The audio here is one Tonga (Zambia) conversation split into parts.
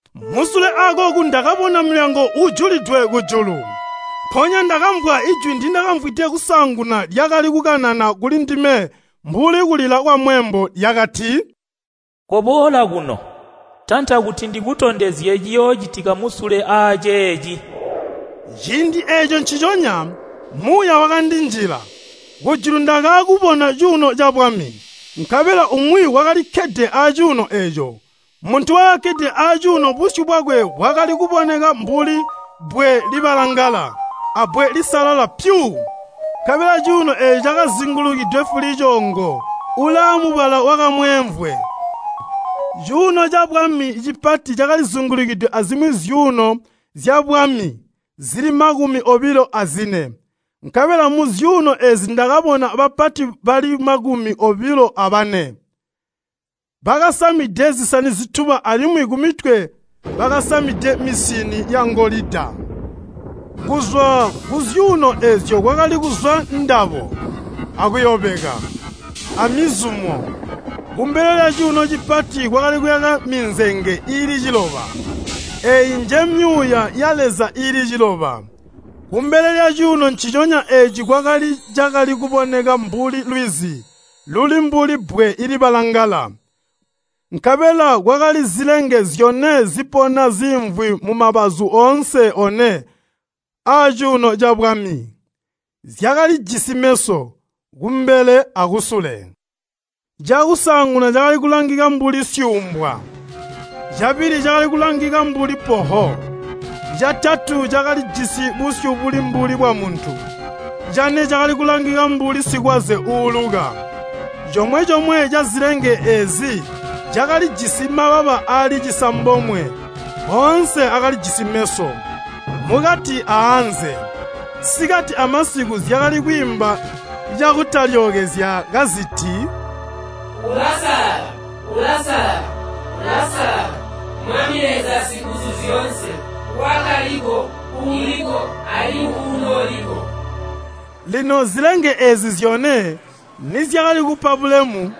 Musule akooku ndakabona mulyango uujulidwe kujulu. Mpoonya ndakamvwa jwi ndindakamvwide kusaanguna lyakali kukanana kuli ndime mbuli kulila kwamweembo, lyakati, “Koboola kuno, tanta kuti ndikutondezye ciyoocitika musule aaceeci.” Ciindi eeco nciconya, Muuya wakandinjila. Kujulu ndakaakubona cuuno cabwami, nkabela umwi wakalikkede acuuno eeco. Muntu wakakkede acuuno busyu bwakwe bwakali kuboneka mbuli bbwe libalangala abbwe lisalala pyu, nkabela cuuno eeco cakazingulukidwe fulicoongo ulaamubala wakamweemvwe. Cuuno cabwami cipati cakalizingulukidwe azimwi zyuuno zyabwami zili makumi obilo azine. Nkabela muzyuuno eezi ndakabona bapati bali makumi obilo abane, bakasamide zisani zituba alimwi kumitwe bakasamide misini yangolida. Kuzwa kuzyuuno eezyo kwakali kuzwa ndabo, akuyobeka, amizumo. Kumbele lyacuuno cipati kwakali kuyaka minzenge iili ciloba, eeyi njemyuuya ya Leza iili ciloba. Kumbele lyacuuno nciconya eeci kwakali cakali kuboneka mbuli lwizi luli mbuli bbwe libalangala. Nkabela kwakali zilenge zyone zipona ziimvwi mumabazu oonse one aacuuno cabwami, zyakalijisi meso, kumbele akusule. Cakusaanguna cakali kulangika mbuli syuumbwa, cabili cakali kulangika mbuli poho, catatu cakalijisi busyu buli mbuli bwamuntu, cane cakali kulangika mbuli sikwaze uuuluka. Comwe-comwe cazilenge eezi cakalijisi mababa aali cisambomwe, oonse akalijisi meso, mukati aanze. Sikati amasiku zyakali kwiimba cakutalyookezya kaziti, “Ulasalala, Ulasalala, Ulasalala, Mwami Leza Singuzuzyoonse, Wakaliko, Uuliko, alimwi Uunooliko.” Lino zilenge eezi zyone, nizyakali kupa bulemu,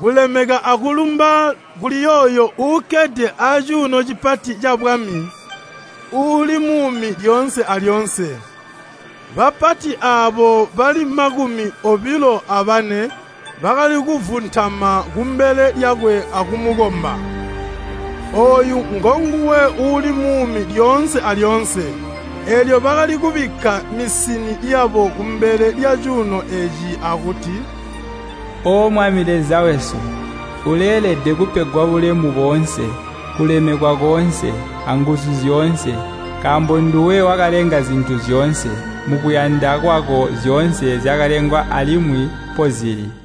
kulemeka akulumba kuli yooyo uukkede acuuno cipati cabwami uuli muumi lyoonse alyoonse, bapati aabo bali makumi obilo abane bakali kuvuntama kumbele lyakwe akumukomba. Ooyu ngonguwe uuli muumi lyoonse alyoonse. Eelyo bakali kubikka misini yabo kumbele lyacuuno eeco akuti, “O Mwami Leza wesu! Uleelede kupegwa bulemu boonse, kulemekwa koonse, anguzu zyoonse, nkaambo nduwe wakalenga zintu zyoonse. Mukuyanda kwako zyoonse zyakalengwa alimwi mpozili.”